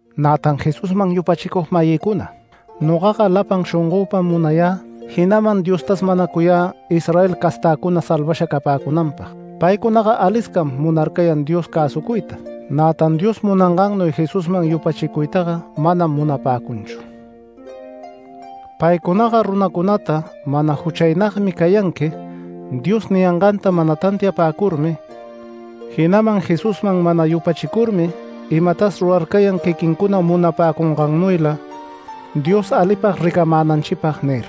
Nätan Jesusman yupachicug-mayïcuna, nogaga lapan shongöpam munayä, jinaman Diostas manacuyä Israel castäcuna salvasha capäcunanpag. Paycunaga aliscam munarcayan Dios cäsucuyta. Nätan Dios munangannuy Jesusman yupachicuytaga manam munapäcunchu. Paycunaga runacunata “Mana juchaynagmi cayanqui” Dios niyanganta mana tantiapäcurmi, jinaman Jesusman mana yupachicurmi imatas ruracayan quiquincuna munapäcungannuyla “Dios alipag ricamänanchipag” nir.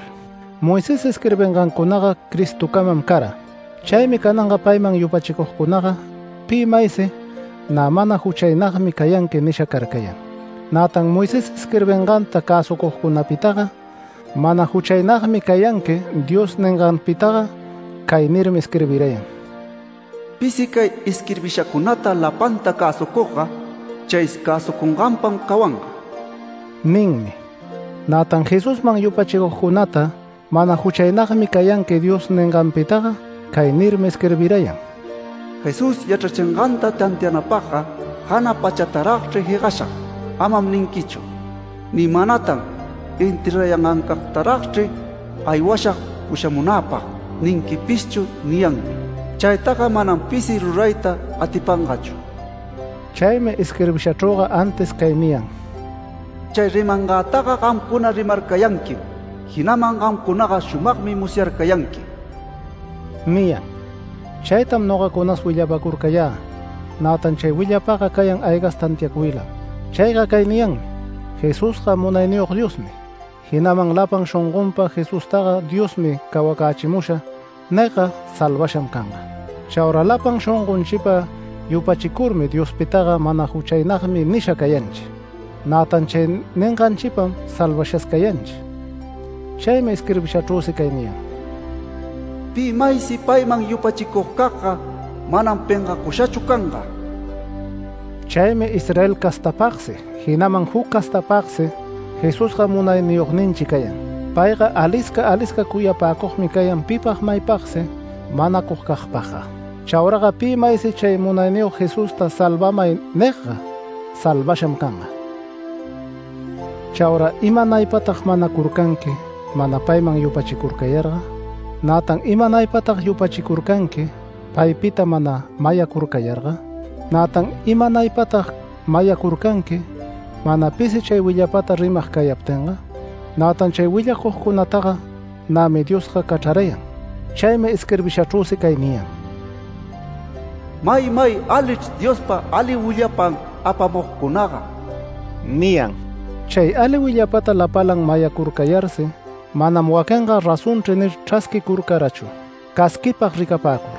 Moisés isquirbingancunaga Cristocamam cara. Chaymi cananga payman yupachicugcunaga pi maysi “Nä mana juchaynagmi cayanqui” nisha carcayan. Nätan Moisés isquirbinganta cäsucugcunapitaga “Mana juchaynagmi cayanqui” Dios ninganpitaga cay nirmi isquirbirayan: “Pisi cay isquirbishacunata lapanta cäsucugga chay cäsucunganpam cawanga” ninmi. Nätan Jesusman yupachicugcunata “Mana juchaynagmi cayanqui” Dios ninganpitaga, cay nirmi isquirbirayan: “Jesús yachrachinganta tantianapagga ‘Jana pachataragchri jegashag’ amam ninquichu”. Ni manatan “ ‘Enterrarayangancagtaragchri aywashag pushamunäpag’ ninquipischu” niyanmi. Chaytaga manam pisi rurayta atipangachu. Chaymi isquirbishachrüga antis cay niyan: “Chay rimangätaga gamcuna rimarcayanquim, jinaman gamcunaga shumagmi musyarcayanqui” niyan. Chaytam nogacunas willapacurcayä. Nätan chay willapaga cayan aygas tantiacuylam. Chayga cay niyanmi: “Jesusga Munayniyog Diosmi”. Jinaman lapan shongonpa “Jesustaga Diosmi cawacächimusha” nigga salvasham canga. Chaura lapan shongonchipa yupachicurmi Diospitaga “Mana juchaynagmi” nisha cayanchi. Nätan chay ninganchipam salvashas cayanchi. Chaymi isquirbishachrüsi cay niyan: “Pi maysi payman yupachicugcagga, manam pengacushachu canga”. Chaymi Israel castapagsi, jinaman juc castapagsi Jesusga Munayniyogninchi cayan. Payga alisca alisca cuyapäcugmi cayan pipag maypagsi manacugcagpagga. Chauraga pi maysi chay Munayniyog Jesusta “Salvamay” nigga salvasham canga. Chaura ¿imanaypatag manacurcanqui mana payman yupachicurcayarga? Nätan ¿imanaypatag yupachicurcanqui paypita mana mayacurcayarga? Nätan ¿imanaypatag mayacurcanqui, mana pisi chay willapata rimag cayaptinga? Nätan chay willapacugcunataga nämi Diosga cachrarayan. Chaymi isquirbishachrüsi cay niyan: “¡Maymay alichr Diospa ali willapan apamugcunaga!” niyan. Chay ali willapata lapalan mayacurarcayarsi, manam waquinga “Razonchri” nir chrasquicurcarachu, casquipag ricapäcur.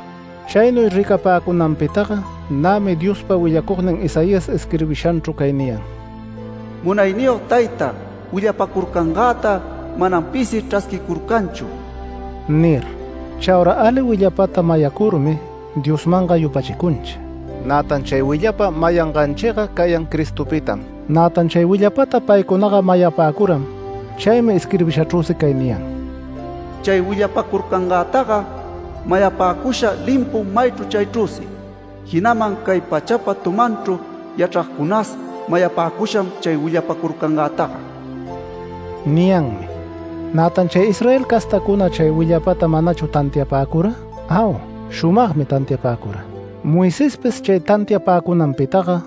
Chaynuy ricapäcunanpitaga nämi Diospa willacugnin Isaías isquirbishanchru cay niyan: “Munayniyog Tayta, willapäcurcangäta manam pisi chrasquicurcanchu” nir. Chaura ali willapata mayacurmi Diosmanga yupachicunchi. Nätan chay willapa mayanganchiga cayan Cristopitam. Nätan chay willapata paycunaga mayapäcuram. Chaymi isquirbishachrüsi cay niyan: “Chay willapacurcangantaga mayapäcusha limpum maychru chaychrüsi. Jinaman cay pachapa tumanchru yachracunas mayapäcusham chay willapacurcangantaga” niyanmi. Nätan ¿chay Israel castäcuna chay willapata manachu tantiapäcura? Au, shumagmi tantiapäcura. Moisespis chay tantiapäcunanpitaga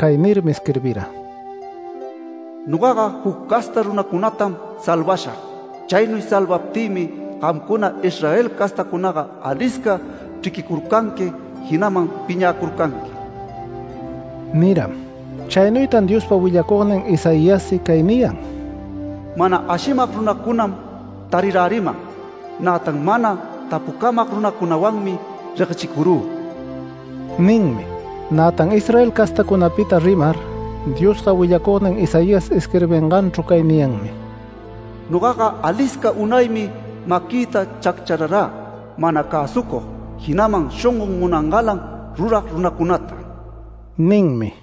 cay nirmi isquirbira: “Nogaga juc casta runacunatam salvashag. Chaynuy salvaptïmi gamcuna Israel castacunaga alisca chriquicurcanqui, jinaman piñäcurcanqui” niram. Chaynuytan Diospa willacugnin Isaiassi cay niyan: “Mana ashimag runacunam tariräriman. Nätan mana tapucamag runacunawanmi reguechicurü” ninmi. Nätan Israel castacunapita rimar, Diosga willacugnin Isaías isquirbinganchru cay niyanmi: “Nogaga alisca unaymi maquïta chacchararä mana cäsucug, jinaman shongon munangalan rurag runacunata” ninmi.